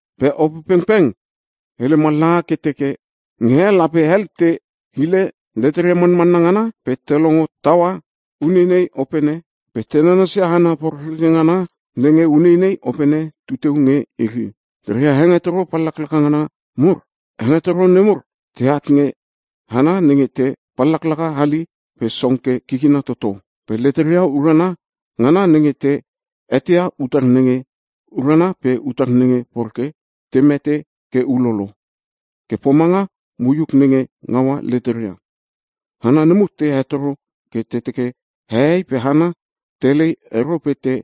Pe Opepengpeng hele mallaha ke teke, nge he lape hel te hile leteria manmanna ngana pe te longo taua uneinei opene pe te nanasia hana porekreke ngana nenge uneinei opene tuteu nge iri, reria hengetoro pallaklaka ngana mur. Hengetoro nemur teat nge hana nenge te pallaka hali pe song ke kikina toto. Pe leteria urana ngana nenge te eteia utar nenge urana pe utar nenge poreke te mete ke ulolo ke pomanga moiuk nge ngaua leteria. Hana nemur te hetoro ke te teke hehei pe hana telei ero pe te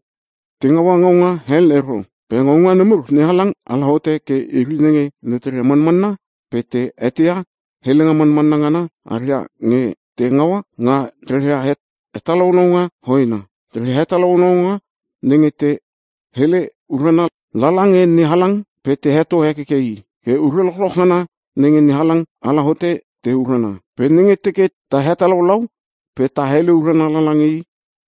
ngaua ngaunga hel ero. Pe ngaunga nemur NeHalang ala hote ke iri nenge leteria manmanna pe te eteia helenga manmanna ngana aria nge te ngaua nga reria hetalaulaunga hoena. Reria hetalaulaunga nenge te hele urana lala nge NeHalang pe te heto hekeke I. Ke Ure lochloch ngana nenge NeHalang ala hote te urana. Pe nenge teke ta hetalaulau pe ta hele urana lange I,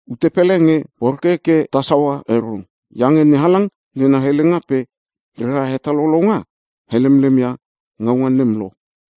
ute pele nge poreke ke ta saua ero. Iange NeHalang nena helenga pe rera hetalaulaunga helemlemia ngaunga nem lo.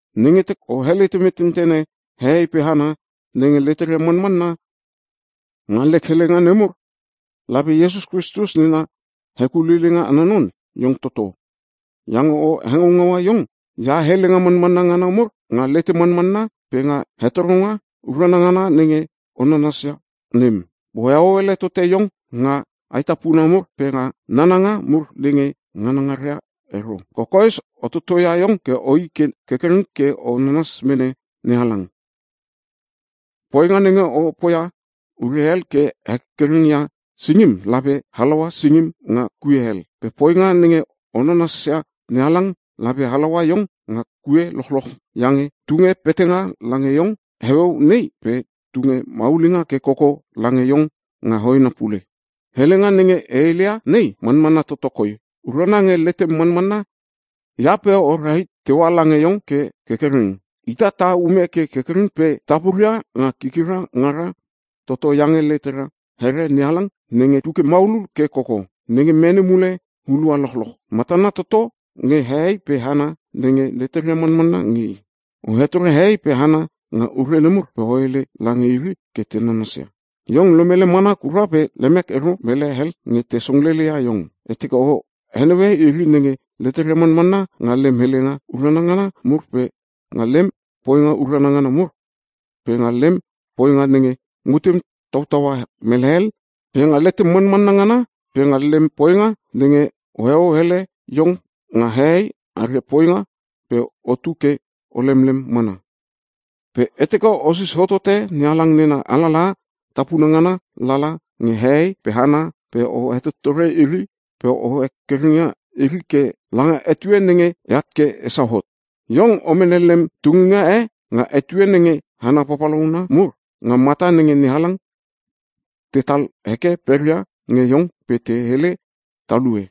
Nenge teke o helete metentene hehei pe hana nenge leteria manmanna nga lek helenga nemur, lape Iesus Kristus nena hekuleileinga ana non iong toto. Iange o hengaungaua iong ia helenga manmanna ngana mur nga lete manmanna pe nga hengetoro urana ngana nenge o nanasia nem. Pe oheo ele tote iong nga aetapuna mur pe nga nananga mur nenge nganangaria ero. Kokoes o totoia iong ke oi ke kerkereng ke o nanas mene NeHalang. Poinga nenge o poia ure hel ke hekerkereng ia singim lape halaua singim nga kue hel. Pe poinga nenge o nanasia NeHalang lape halaua iong nga kue lochloch iange tunge petanga lange iong heueu nei pe tunge maulinga ke koko lange iong nga hoena pule. Helenga nenge e heleia nei manmanna toto koi. Urana nge letem manmanna ia pe o rahit teua lange iong ke kerkereng. Ita ta ume ke kerkereng pe ta puria nga kikira ngara toto iange letera here NeHalang nenge tuke maulul ke koko nge mene mule hulua lochloch. Matana toto nge hehei pe hana nenge leteria manmanna nge I. O hetore hehei pe hana nga ure nemur pe o hele lange iri ke te nanasia. Iong lomele mana kura pe lemek ero mele hel nge te songlele ia iong. E teke o heneue iri nenge leteria manmanna nga lem helenga urana ngana mur pe nga lem poinga urana ngana mur pe nga lem poinga nenge mutem tautaua mele hel pe nga letem manmanna ngana pe nga lem poinga nenge oheo hele iong nga hehei aria poinga pe otu ke o lemlem mana. Pe e teke osis hotote NeHalang nena alalaha tapuna ngana lala nge hehei pe hana pe o hetottore iri pe o hekerkereng ia iri ke langa etue nenge eat ke esau hot. Iong o mene lem tunginga e nga etue nenge hana papalauna mur nga mata nenge NeHalang tetal heke peria nge iong pe te hele talue.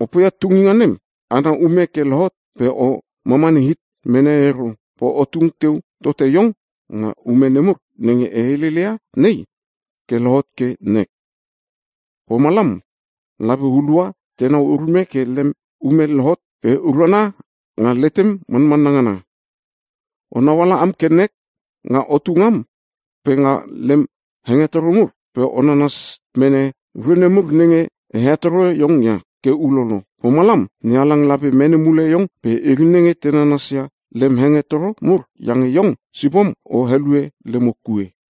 Opoia tunginga nem ana ume ke lohot pe o mamani hit mene ero. Pe o tung teu tote iong nga ume nemur nenge e heleleia nei ke lohot ke nek. Pomalam lape hulua tenau urume ke lem ume lohot ke urana nga letem manmanna ngana. Onau ala am ke nek nga otu ngam pe nga lem hengetoro mur pe o nanas mene ure nemur nenge e hetoro iong ia ke ulolo. Pomalam, NeHalang lape mene mule iong pe iri nenge te nanasia lem hengetoro mur iange iong sipom o helue lemo kue.